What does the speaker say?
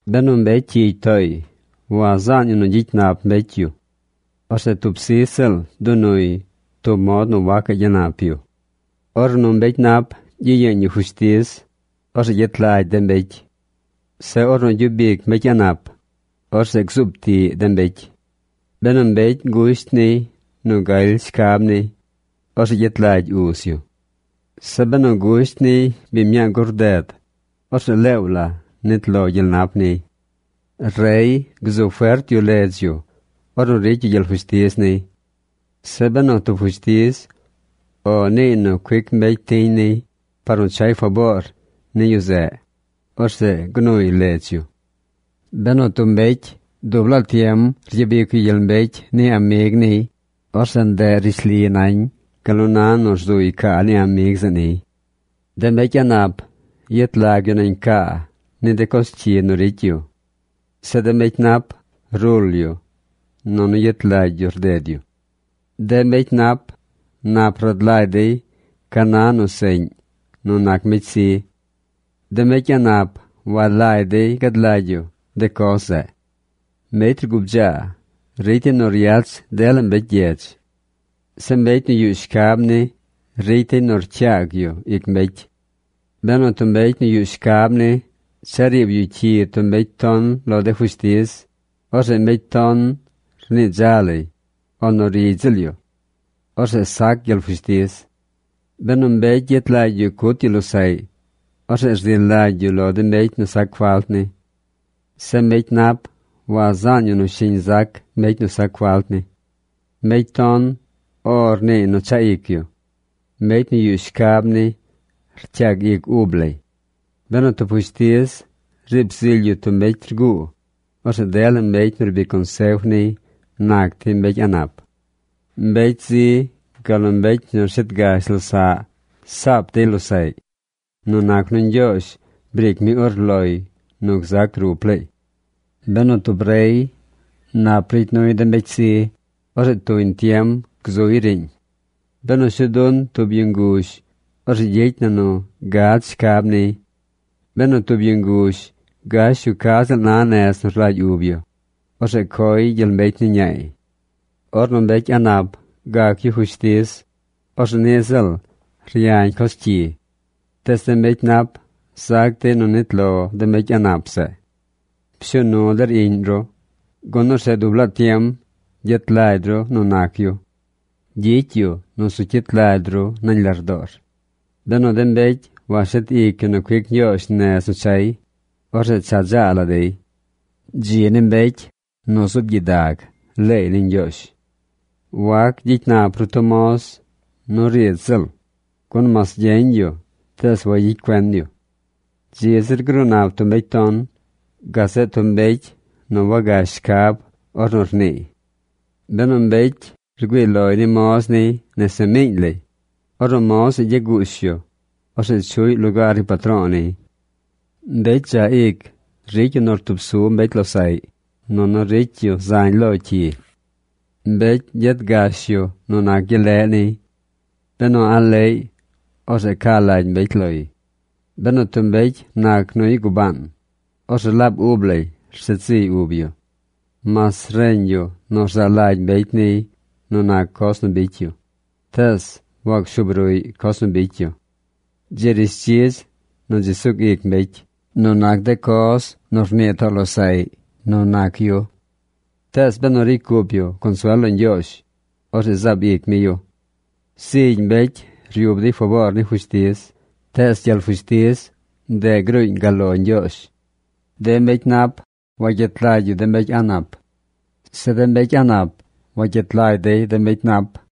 Benu mbecy cyigy tooy, wazaan yu nu gyicy nap mbecy yu. Orzeꞌ tub sij ziꞌl dunuy tub mod nu wacaꞌ gyanap yu. Ornu mbecy nap gyiyeeñ yu fushtiz, orzeꞌ gyet lagy de mbecy. Zeꞌ ornu gyub ic mbecy a̱ꞌ nap, orzeꞌ gzuub tiꞌ de mbecy. Benu mbecy gusht niy nu galy shcab niy, orzeꞌ gyet lagy uz yu. Zeꞌ benu gusht niy biñ mñaa gur rded, orzeꞌ leew la nit lo gyel nap niy. Rey gzu fert yu ledz yu ornu ricy yu gyel fushtiz niy. Zeꞌ benu tub fushtiz “O” niiy nu cuic mbecy tiñ niy par nu chay faboor ni yu zeꞌ, orzeꞌ gnuy ledz yu. Benu tub mbecy dub laa tiem ryabic yu gyel mbecy ni amig niy, orzeꞌ ndeꞌ rishli nañ gal nu na nu rzuy caa ni amig zeꞌ niy. De mbecy a̱ꞌ nap yet lag yu nañ caa ni de coz cyi nu ricy yu. Zeꞌ de mbecy nap rul yu nunu yet lagy yu rded yu. De mbecy nap nap rad lagy dey ca na nu seꞌñ nu nac mbecy zi. De mbecy a̱ꞌ nap walagy dey gad lagy yu de coz zeꞌ. Mbecy rgubdzaa ricy dey nu ryach dela mbecy gyedz. Zeꞌ mbecy nu yuꞌ shcab ni ricy dey nu rcyaag yu ic mbecy. Benu tub mbecy nu yuꞌ shcab ni cha riib yu cyi tub mbecy ton lo de fushtiz, orzeꞌ mbecy ton rnii dza lay, o nu rigy ziꞌl yu. Orzeꞌ sac gyel fushtiz. Benu mbecy yet lagy yu cut yu losaꞌy, orzeꞌ rzi lagy yu lo de mbecy nu sac falt ni. Zeꞌ mbecy nap wazaan yu nu shiñ zac mbecy nu sac falt ni. Mbecy ton “O” rniiy nu chaꞌ ic yu. Mbecy nu yuꞌ shcab ni rcyaag ic ub lay. Benu tub fushtiz riib zily yu tub mbecy rguu, orzeꞌ dela mbecy nu rbic consef niy nac dey mbecy a̱ꞌ nap. Mbecy zi gal nu mbecy nu rshet gash losaꞌ saap dey losaꞌy nu nac nu Ñgyoozh briic mi urloy nu gzac rup laay. Benu tub rey nap ricy nuy de mbecy zi, orzeꞌ tuñ tiem gzuy riiñ. Benu shuu dun tub yu nguzh, orzeꞌ gyicy na nu gad shcab niy. Benu tub yu nguzh gash yu ca ziꞌl na nez nu rlagy ub yu, orzeꞌ coy gyel mbecy ni ñaay. Ornu mbecy a̱ꞌ nap gac yu fushtiz, orzeꞌ niꞌ ziꞌl ryañ coz cyi. Tees de mbecy nap zac dey nu nit lo de mbecy a̱ꞌ nap zeꞌ. Pshuu nu der iꞌñ ru, gun orzeꞌ dub laa tiem gyet lagy ru nu nac yu. Gyicy yu nu zu cyit lagy ru nañ lardoor. Benu de mbecy washet ic yu nu cuic Ñgyoozh nez nu chay, orzeꞌ cha dzaa la dey. Dzi ni mbecy nu zuub gyidag leey ni Ñgyoozh. Wac gyicy nap ru tub moz nu riidz ziꞌl, gun mas gyeñ yu, tees wayicy cuen yu. Dzi zir gruu nap tub mbecy ton gazeꞌ tub mbecy nu wagash shcab ornu niiy. Benu mbecy güii loy ni moz niy nese miiñ lay, ornu moz zeꞌ gya guush yu, orzeꞌ chuꞌy lugaar ni patro̱o̱ niy. Mbecy dzaꞌ ic ricy yu nu rtub su mbecy losaꞌy, nunu ricy yu zañ lo cyi. Mbecy gyet gash yu nu nac gyel leꞌ niy. Benu a̱ꞌ leꞌy orzeꞌ ca lagy mbecy loy. Benu tub mbecy nac nuy gubaan, orzeꞌ laab ub lay rshet ziy ub yu. Mas reñ yu nu rzaa lagy mbecy niy nu nac coz nu bicy yu, tees wacshuub ruꞌy coz nu bicy yu. Dzi rishdzidz nu dzi sug ic mbecy nu nac de coz nu rnii too losaꞌy nu nac yu. Tees benu ricy cup yu consuel lo Ñgyoozh, orzeꞌ zaab ic mi yu. Zigy mbecy ryub dey faboor ni fushtiz. Tees gyel fushtiz, ndeꞌ gruuñ gal lo Ñgyoozh. De mbecy nap wagyet lagy yu de mbecy a̱ꞌ nap. Zeꞌ de mbecy a̱ꞌ nap wagyet lagy dey de mbecy nap.